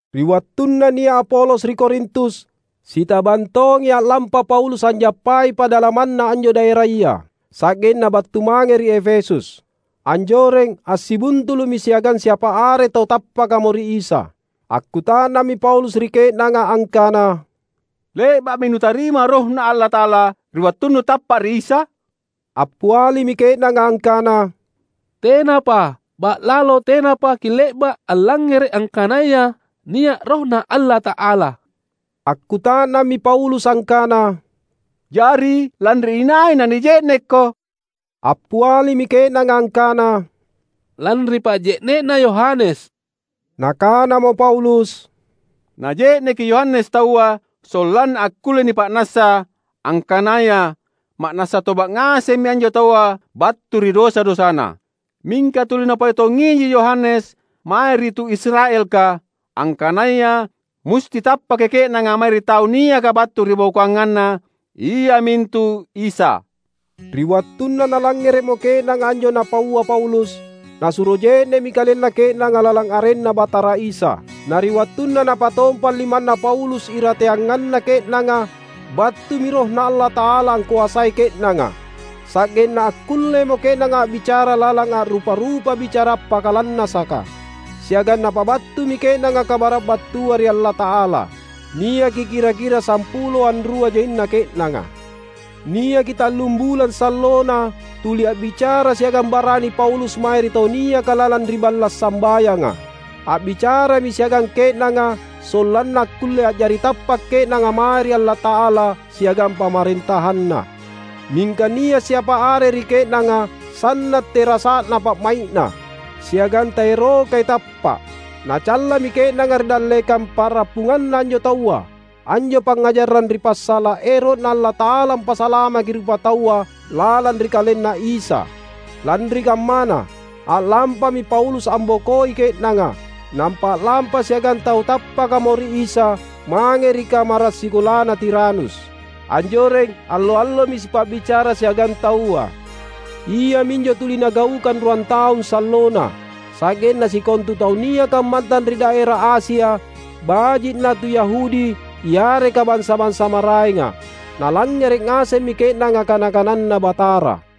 Ri wattunna nia’ Apolos ri Korintus, sitabang tongi a’lampa Paulus anjappai padalamanna anjo daeraya, sa’genna battu mange ri Efesus. Anjoreng, assibuntulu’mi siagang siapa are tau tappakamo ri Isa. Akkuta’nammi Paulus ri ke’nanga angkana, "Le’ba’mi nutarima RohNa Allata’ala ri wattunnu tappa’ ri Isa?" Appialimi ke’nanga angkana, "Tenapa. Ba’lalo tenapa kile’ba’ allangngere’ angkanaya nia’ RohNa Allata’ala." Akkuta’nammi Paulus angkana, "Jari lanri inai nanije’nekko?" Appialimi ke’nanga angkana, "Lanri pa’je’ne’na Yohanes." Nakanamo Paulus, "Naje’neki Yohanes taua sollanna akkulle nipa’nassa angkanaya ma’nassa toba’ ngasemmi anjo taua battu ri dosa-dosana. Mingka tuli napau tongiji Yohanes mae ri tu Israelka, angkanaya musti tappaki ke’nanga mae ri Tau niaka battu ribokoanganna, iamintu Isa." Ri wattunna nalangngere’mo ke’nanga anjo napaua Paulus, nasuro je’ne’mi kalenna ke’nanga lalang arenNa Batara Isa. Na ri wattunna napatompang limanna Paulus irateanganna ke’nanga, battumi RohNa Allata’ala angkoasai ke’nanga; sa’genna akkullemo ke’nanga a’bicara lalang a’rupa-rupa bicara appakalannasaka, siagang napabattumi ke’nanga kabara’ battua ri Allata’ala. Niaki kira-kira sampulo anrua jaina ke’nanga. Niaki tallum bulang sallona tuli a’bicara siagang barani Paulus mae ri tau niaka lalang ri balla’ sambayanga. A’bicarami siagang ke’nanga sollanna akkulle a’jari tappa’ ke’nanga mae ri Allata’ala siagang PamarentahanNa. Mingka nia’ siapa are ri ke’nanga sanna’ terasa’na pa’mai’na, siagang taerokai tappa’. Nacallami ke’nanga ri dallekang pa’rappunganna anjo taua, anjo pangngajarang ri passala’ ero’Na Allata’ala ampasalamaki rupataua lalang ri KalenNa Isa. Lanri kammana, a’lampami Paulus ambokoi ke’nanga, nampa a’lampa siagang tau tappakamo ri Isa mange ri kamara’ sikolana Tiranus. Anjoreng, allo-allomi sipa’bicara siagang taua. Iaminjo tuli nagaukang ruan taung sallona, sa’genna sikontu tau niaka ammantang ri daera Asia, baji’ na tu Yahudi yareka bansa-bansa maraenga, nalangngere’ ngasemmi ke’nanga kana-kananNa Batara.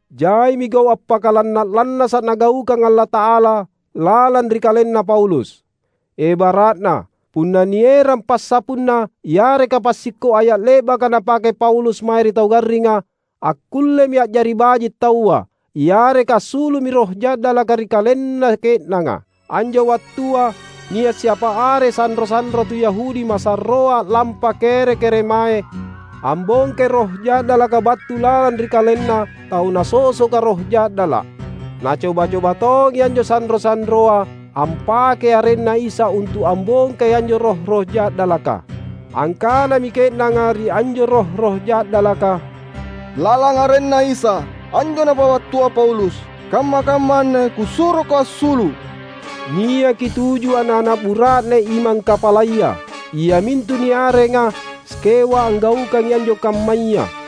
Jaimi gau’ appakalanna’-lannasa’ Nagaukang Allata’ala lalang ri kalenna Paulus. Ebara’na, punna nierang passapunna yareka passikko’ aya’ le’baka napake Paulus mae ri tau garringa, akkullemi a’jari baji’ taua, yareka assulu’mi roh ja’dalaka ri kalenna ke’nanga. Anjo wattua nia’ siapa are sanro-sanro tu Yahudi masarroa a’lampa kere-keremae ambongkai roh ja’dalaka battu lalang ri kalenna tau nasosoka roh ja’dala’. Nacoba-coba tongi anjo sanro-sanroa ampakei arenNa Isa untu’ ambongkai anjo roh-roh ja’dalaka. Angkanami ke’nanga ri anjo roh-roh ja’dalaka, "Lalang arenNa Isa, anjo napabattua Paulus, kamma-kamma anne kusuroko assulu’!" Niaki tuju ana’-ana’ bura’nena imang kapalaya, iamintu niarenga Skewa anggaukangi anjo kammaya.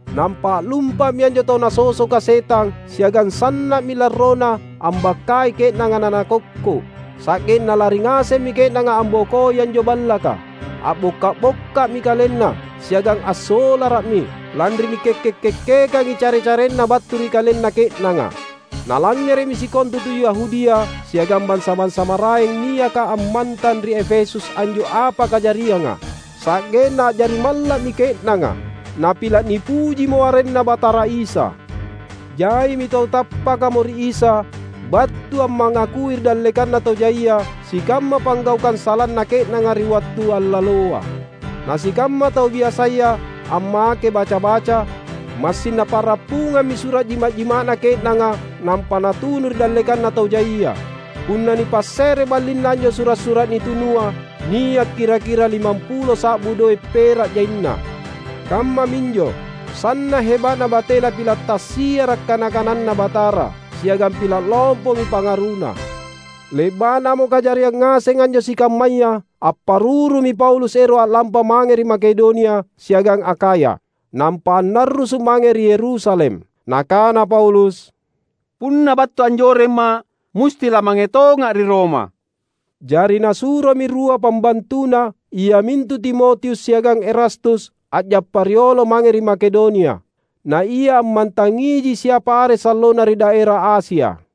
Nampa a’lumpa’mi anjo tau nasosoka setang siagang sanna’mi larrona ambakkai ke’nanga nanakokko’. Sa’genna lari ngasemmi ke’nanga ambokoi anjo ballaka. A’bokka’-bokka’mi kalenna, siagang assolara’mi, lanri nikekke’-kekkekangi care-carena battu ri kalenna ke’nanga. Nalangngere’mi sikontu tu Yahudia siagang bansa-bansa maraeng niaka ammantang ri Efesus anjo apa kajarianga, sa’genna a’jari malla’mi ke’nanga. Napila’ nipujimo arenNa Batara Isa. Jaimi tau tappakamo ri Isa battu ammangakui ri dallekanna tau jaia sikamma panggaukang salana ke’nanga ri wattu allaloa. Na sikamma tau biasaya ammake baca-baca, massing napa’rappungammi sura’ jima’-jima’na ke’nanga nampa natunu ri dallekanna tau jaia. Punna nipasse’re ballinna anjo sura’-sura’ nitunua, nia’ kira-kira limampulo sa’bu doe’ pera’ jaina. Kammaminjo, sanna’ heba’na batena pila’ tassiara’ kana-kananNa Batara, siagang pila’ lompomi pangaruna. Le’ba’namo kajariang ngaseng anjo sikammaya, apparurumi Paulus ero’ a’lampa mange ri Makedonia siagang Akhaya, nampa annarrusu’ mange ri Yerusalem. Nakana Paulus, "Punna battu anjoremma’ musti lamange tonga’ ri Roma." Jari nasuromi rua pambantuna, iamintu Timotius siagang Erastus, a’jappa riolo mange ri Makedonia. Na ia ammantangiji siapa are sallona ri daera Asia.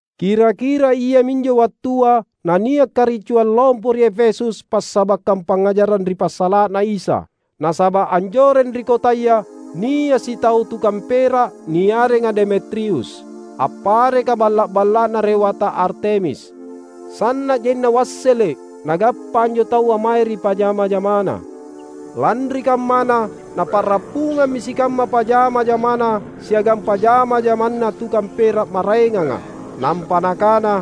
Kira-kira iaminjo wattua nania’ karicuang lompo ri Efesus passabakkang pangngajarang ri passala’na Isa. Nasaba’ anjoreng ri kotaya nia’ sitau tukang pera’, niarenga Demetrius, appareka balla’-balla’na Rewata Artemis. Sanna’ jaina wassele’ nagappa anjo taua mae ri pajama-jamana. Lanri kammana napa’rappungammi sikamma pajama-jamana siagang pajama-jamana tukang pera’ maraenganga; nampa nakana,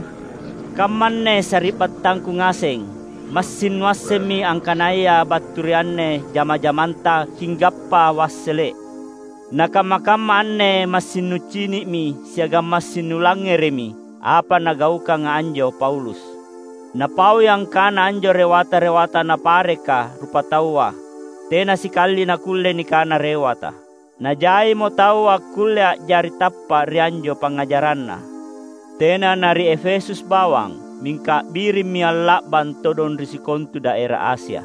"Kammanne sari’battangku ngaseng! Massing nuassemmi angkanaya battu ri anne jama-jamanta kinggappa wassele’. Na kamma-kamma anne massing nucini’mi siagang massing nulangngere’mi, apa nagaukanga anjo Paulus. Napaui angkana anjo rewata-rewata napareka rupataua tena sikali nakkulle nikana rewata. Najaimo tau akkulle a’jari tappa’ ri anjo pangngajaranna; tena na ri Efesus bawang mingka a’birimmi a’la’bang todong ri sikontu daera Asia.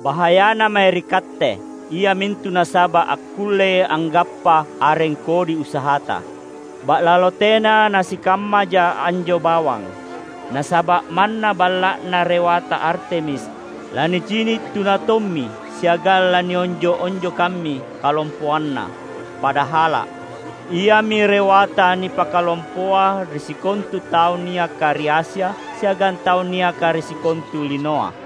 Bahayana mae ri katte, iamintu nasaba’ akkullei anggappa areng kodi usahata. Ba’lalo tena nasikammaja anjo bawang, nasaba’ manna balla’na Rewata Artemis lanicini’ tuna tommi siagang lanionjo’-onjokammi kalompoanna; padahala’, iami rewata nipakalompoa ri sikontu tau niaka ri Asia siagang tau niaka ri sikontu linoa!"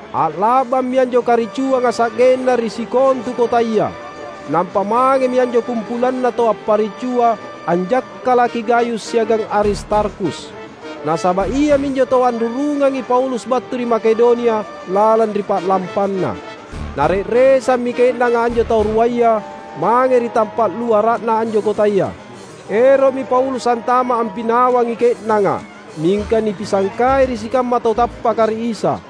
A’la’bammi anjo karicuanga sa’genna ri sikontu kotaya. Nampa mangemi anjo kumpulanna tau apparicua anjakkalaki Gayus siagang Aristarkhus. Nasaba’ iaminjo tau anrurungangi Paulus battu ri Makedonia lalang ri pa’lampanna. Nare’resammi ke’nanga anjo tau ruaya mange ri tampa’ luara’na anjo kotaya. Ero’mi Paulus antama’ ampinawangi ke’nanga, mingka nipisangkai ri sikamma tau tappaka ri Isa.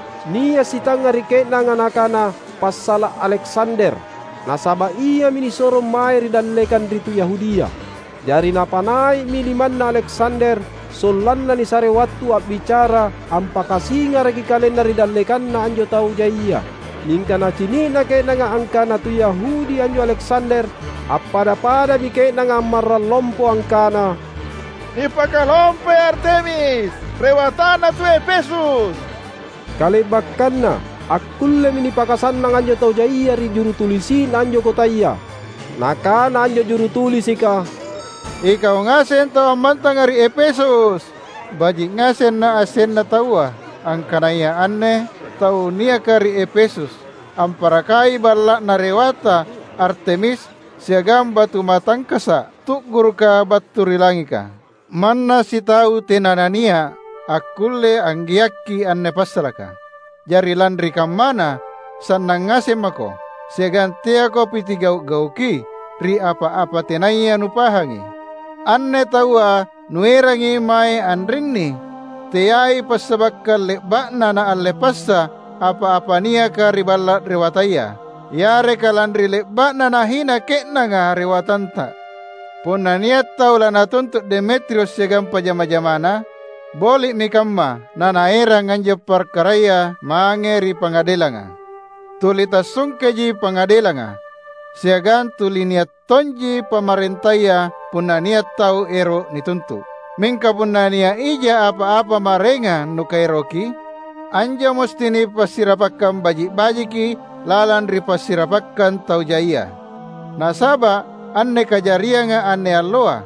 Nia’ sitangnga ri ke’nanga nakana passala’ Aleksander, nasaba’ iami nisorong mae ri dallekang ri tu Yahudia. Jari napanai’mi limanna Aleksander sollanna nisare wattu a’bicara ampakasingaraki kalenna ri dallekanna anjo tau jaia. Mingka nacini’na ke’nanga angkana tu Yahudi anjo Aleksander, appada-padami ke’nanga ammarrang lompo angkana, "Nipakalompoi Artemis, rewatana tu Efesus!" Kale’bakkanna akkullemi nipakasannang anjo tau jaia ri jurutulisi’na anjo kotaya. Nakana anjo jurutulisika, "Ikau ngaseng tau ammantanga ri Efesus! Baji’ ngaseng naassenna taua angkanaya anne tau niaka ri Efesus amparakai balla’na Rewata Artemis siagang batu matangkasa’ tu’guruka battu ri langika. Manna sitau tena nania’ akkulle anggeakki anne passalaka. Jari lanri kammana, sannang ngaseng mako, siagang teako pitigau’-gauki ri apa-apa tenaya nupahangi. Anne taua nuerangi mae anrinni teai passabakkang le’ba’na naalle passa apa-apa niaka ri balla’ rewataya, yareka lanri le’ba’na nahina ke’nanga rewatanta. Punna nia’ tau lanatuntu’ Demetrius siagang pajama-jamana, boli’mi kamma nanaerang anjo parkaraya mange ri pangadelanga. Tuli tassungkeji pangadelanga, siagang tuli nia’ tonji pamarentaya punna nia’ tau ero’ nituntu’. Mingka punna nia’ ija apa-apa maraengang nukaeroki, anjo musti nipassirapakkang baji’-bajiki lalang ri passirapakkang tau jaia. Nasaba’ anne kajarianga anne alloa,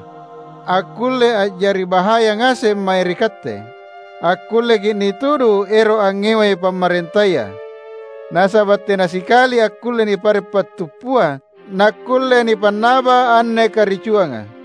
akkullei a’jari bahaya ngaseng mae ri katte. Akkulleki’ nitudu ero’ angngewai pamarentaya, nasaba’ tena sikali akkulle nipare’ pattuppuang nakkulle nipannaba anne karicuanga."